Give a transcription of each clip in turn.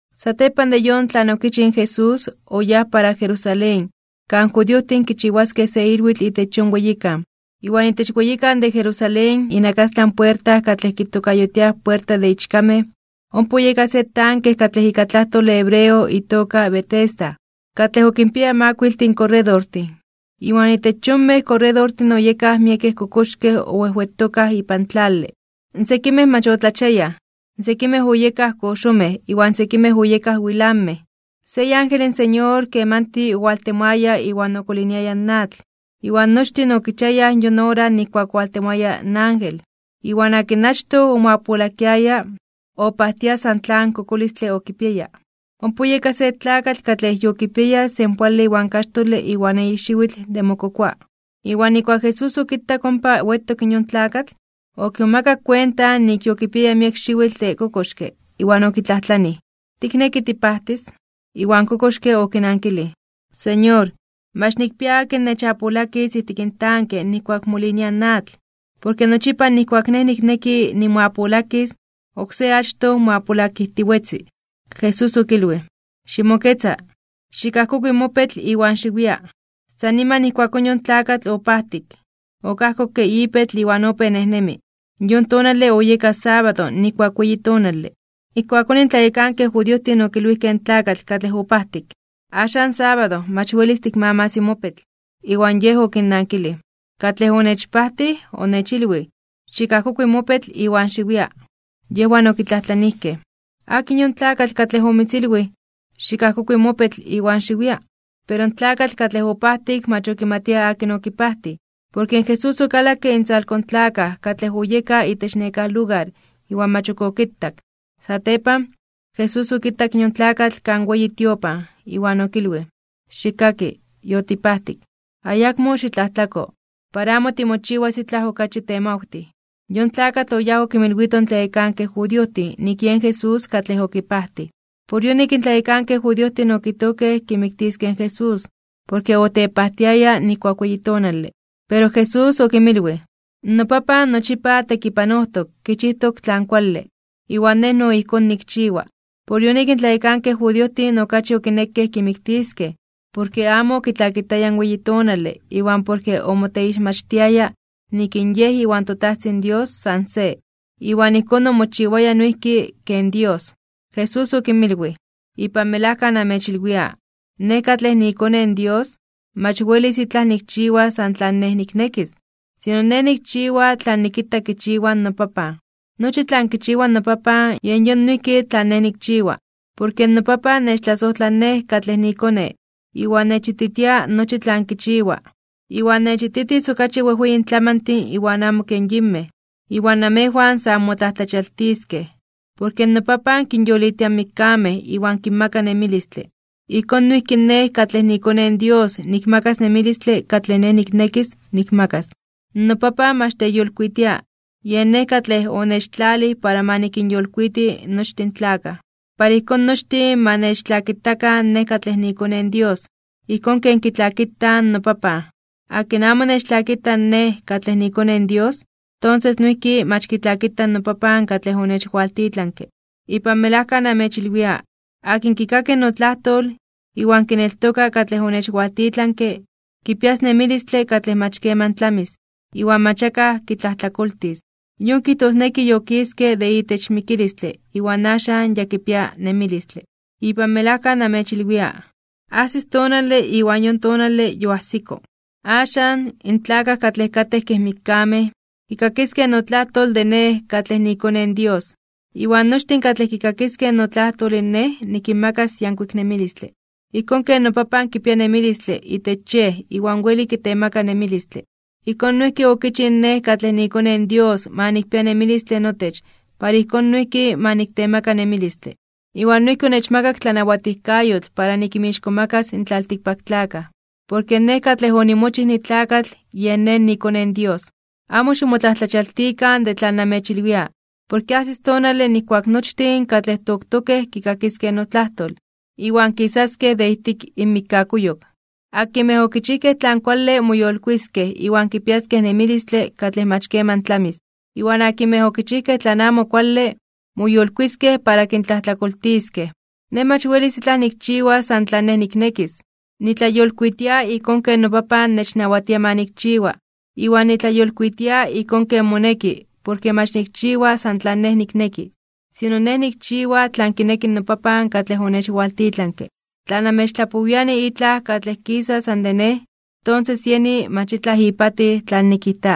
Satepan de yon tlan okichij in Jesús, oyáj para Jerusalén, kan judiojtin kichiwaskej se ilwitl itech yon weyikan. Iwan itech weyikan de Jerusalén, inakastlan puerta katlej kitokayotiaj puerta de ichkamej, ompa oyeka se tanke katlej ika tlajtole hebreo itoka Betesda, katlej okinpiaya makuile korredortin. Iwan itech yonmej korredortin oyekaj miekej kokoxkej owejwetokaj ipan tlale. Sekimej mach otlachiayaj, sekimej oyekaj koxomej iwan sekimej oyekaj wilanmej (temetlamej). Se iángel in Señor kemanti owaltemoaya iwan okoliniaya in atl. Iwan nochtin okichiayaj yon ora nijkuak owaltemoaya in ángel. Iwan akin achtoj omoapolakiaya, opajtia san tlan kokolistle okipiaya. Ompa oyeka se tlakatl katlej yokipiaya senpoale iwan kaxtole iwan eyi xiwitl de mokokoa. Iwan nijkuak in Jesús okitak ompa wetok in yon tlakatl, okimomakak kuenta nik yokipiaya miek xiwitl de kokoxke, iwan okitlajtlanij: ―¿Tikneki tipajtis? Iwan in kokoxke okinankilij: ―Señor, mach nikpia akin nechapolakis ijtik in tanke nijkuak molinia in atl. Porke nochipa nijkuak nej nikneki nimoapolakis, oksé achtoj moapolakijtiwetzi. Jesús okilwij: ―Ximoketza, xikajkokui mopetl iwan xiwia. San niman ijkuakón yon tlakatl opajtik, okajkokke ipetl iwan opéj nejnemi. Yon tonale oyeka sábado nijkuak weyi tonale. Ijkuakón in tlayekankej judiojtin okilwijkej in tlakatl katlej opajtik: ―Axan sábado, mach welis tikmamas mopetl. Iwan yej okinnankilij: ―Katlej onechpajtij, onechilwij: “Xikajkokui mopetl iwan xiwia.” Yejwan okitlajtlanijkej: ―¿Akin yon tlakatl katlej omitzilwij: “Xikajkokui mopetl iwan xiwia”? Pero in tlakatl katlej opajtik mach okimatia akin okipajtij, porke in Jesús okalakke intzalko in tlakaj katlej oyekaj itech nekáj lugar iwan mach ok okitak. Satepan, Jesús okitak in yon tlakatl kan weyi tiopan, iwan okilwij: ―Xikkaki, yotipajtik, ayakmo xitlajtlako, para amo timochiwas itlaj okachi temawtij. Yon tlakatl oyáj okinmilwito in tlayekankej judiojtin nik yen Jesús katlej okipajtij. Por yonik in tlayekankej judiojtin okijtojkej kimiktiskej in Jesús, porke otepajtiaya nijkuak weyi tonale. Pero Jesús okinmilwij: ―NoPapan nochipa tekipanojtok kichijtok tlan kuale, iwan Nej no ijkón nikchiwa. Por yonik in tlayekankej judiojtin okachi okinekej kimiktiskej, porke amo okitlakitaya in weyi tonale iwan porke omoteixmachtiaya nik in Yej iwan toTajtzin Dios san se, iwan ijkón omochiwaya noijki ken Dios. Jesús okinmilwij: ―Ipan melajka namechilwia: Nej katlej niiKone in Dios, mach welis itlaj nikchiwas san tlan Nej niknekis, sino Nej nikchiwa tlan nikita kichiwa noPapan. Nochi tlan kichiwa noPapan, yen yon noijki tlan Nej nikchiwa. Porke noPapan nechtlasojtla Nej katlej niiKone, iwan nechititia nochi tlan kichiwa. Iwan nechititis okachi wejweyin tlamantin iwan amo ken yinmej, iwan namejwan sa anmotlajtlachialtiskej (onmomajmawtiskej). Porke noPapan kinyolitia in mikkamej iwan kinmaka nemilistle. Ijkón noijki Nej katlej niiKone in Dios nikmakas nemilistle katlej Nej niknekis nikmakas. NoPapan mach teyolkuitia, yen Nej katlej onechtlalij para ma nikinyolkuiti nochtin in tlakaj. Para ijkón nochtin ma nechtlakitakan Nej katlej niiKone in Dios, ijkón ken kitlakitaj noPapan. Akin amo nechtlakita Nej katlej niiKone in Dios, tonses noijki mach kitlakita noPapan katlej onechwaltitlanke. ’Ipan melajka namechilwia: Akin kikaki notlajtol, iwan kineltoka katlej onechwaltitlanke, kipias nemilistle katlej mach keman tlamis. Iwan mach akaj kitlajtlakoltis, yon kijtosneki yokiske de itech mikilistle iwan axan yakipia nemilistle. Ipan melajka namechilwia: Ajsis tonale iwan yon tonale yoajsiko. Axan, in tlakaj katlej katej kej mikkamej, kikakiskej notlajtol de Nej katlej niiKone in Dios. Iwan nochtin katlej kikakiskej notlajtol Nej nikinmakas yankuik nemilistle. Ijkón ken noPapan kipia nemilistle itech Yej iwan weli kitemaka nemilistle, ijkón noijki okichij Nej katlej niiKone in Dios ma nikpia nemilistle notech para ijkón noijki ma niktemaka nemilistle. Iwan noijki onechmakak tlanawatijkayotl para nikinmixkomakas (nikintzonmanas) in tlaltikpaktlakaj, porke Nej katlej onimochij nitlakatl yen Nej niiKone in Dios. Amo ximotlajtlachialtikan (ximomajmawtikan) de tlan namechilwia, porke ajsis tonale nijkuak nochtin katlej toktokej kikakiskej notlajtol, iwan kisaskej de ijtik inmikkakuyok. Akinmej okichijkej tlan kuale moyolkuiskej (moyolitiskej) iwan kipiaskej nemilistle katlej mach keman tlamis. Iwan akinmej okichijkej tlan amo kuale, moyolkuiskej para kintlajtlakoltiskej. ’Nej mach welis itlaj nikchiwas san tlan Nej niknekis. Nitlayolkuitia ijkón ken noPapan nechnawatia ma nikchiwa. Iwan nitlayolkuitia ijkón ken moneki porke mach nikchiwa san tlan Nej nikneki, sino Nej nikchiwa tlan kineki noPapan katlej onechwaltitlanke. Tla namechtlapowiani itlaj katlej kisa san de Nej, tonses yeni mach itlaj ipatij tlan nikijta.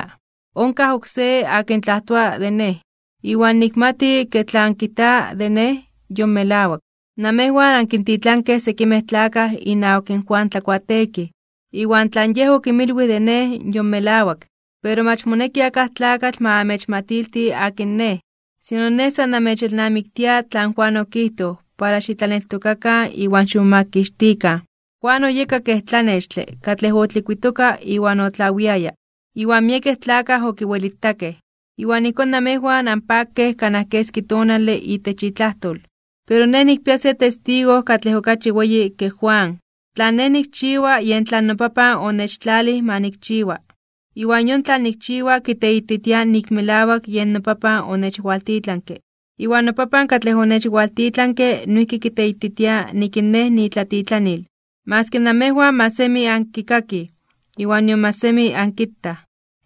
Onkaj oksé akin tlajtoa de Nej, iwan nikmati ke tlan kijta de Nej yon melawak. Namejwan ankintitlankej sekimej tlakaj inawak in Juan Tlakuateekij, iwan tlan yej okinmilwij de Nej yon melawak. Pero mach moneki akaj tlakatl ma amechmatilti akin Nej. Sino Nej san namechelnamiktia tlan Juan okijtoj para xitlaneltokakan iwan ximomakixtikan. Juan oyeka kej tlanextle katlej otlikuitoka iwan otlawiaya, iwan miekej tlakaj okiwelitakej. Iwan ijkón namejwan anpakej kanaj keski tonale itech itlajtol. Pero Nej nikpia se testigo katlej okachi weyi ke Juan. Tlan Nej nikchiwa yen tlan noPapan onechtlalij ma nikchiwa, iwan yon tlan nikchiwa kiteititia nik melawak yen noPapan onechwaltitlanke. Iwan noPapan katlej onechwaltitlanke noijki kiteititia nik in Nej niitlatitlanil, maski namejwan mach semi ankikakij iwan nion mach semi ankitaj.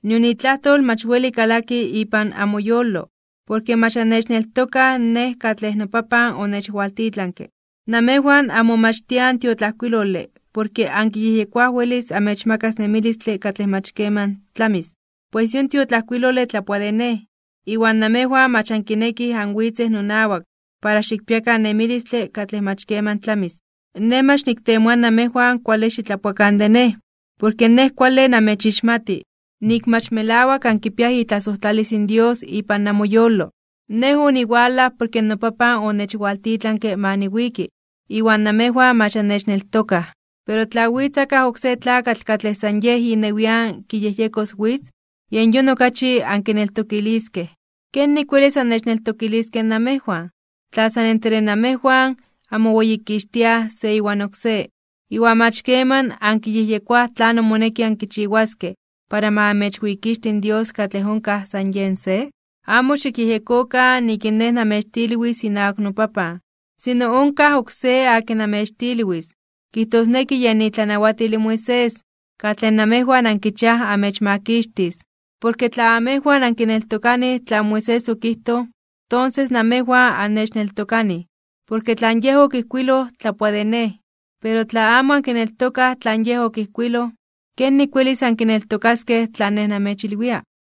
Nion itlajtol mach weli kalaki ipan amoyolo, porke mach annechneltokaj Nej katlej noPapan onechwaltitlanke. Namejwan anmomachtiaj in tiotlajkuilole porke ankiyejyekoaj welis amechmakas nemilistle katlej mach keman tlamis. Pues yon tiotlajkuilole tlapoa de Nej. Iwan namejwan mach ankinekij anwitzej nonawak para xikpiakan nemilistle katlej mach keman tlamis. ’Nej mach niktemoa namejwan kuale xitlapoakan de Nej. Porke Nej kuale namechixmati, nik mach melawak ankipiaj itlasojtlalis in Dios ipan namoyolo. Nej oniwalaj porke noPapan onechwaltitlanke ma niwiki, iwan namejwan mach annechneltokaj. Pero tla witz akaj oksé tlakatl katlej san yej inewian kiyejyekos witz, yen yon okachi ankineltokiliskej. ¿Kenik welis annechneltokiliskej namejwan, tla san entre amejwan anmoweyikixtiaj se iwan oksé, iwan mach keman ankiyejyekoaj tlanon moneki ankichiwaskej para ma amechweyikixti in Dios katlej onkaj san Yej se? Amo xikyejyekokan nik in Nej namechtilwis inawak noPapan. Sino onkaj oksé akin namechtilwis, kijtosneki yen itlanawatil in Moisés, katlej namejwan ankichiaj amechmakixtis. Porke tla amejwan ankineltokanij tlan Moisés okijtoj, tonses namejwan annechneltokanij, porke tlan yej okijkuiloj tlapoa de Nej. Pero tla amo ankineltokaj tlan yej okijkuiloj, ¿kenik welis ankineltokaskej tlan Nej namechilwia?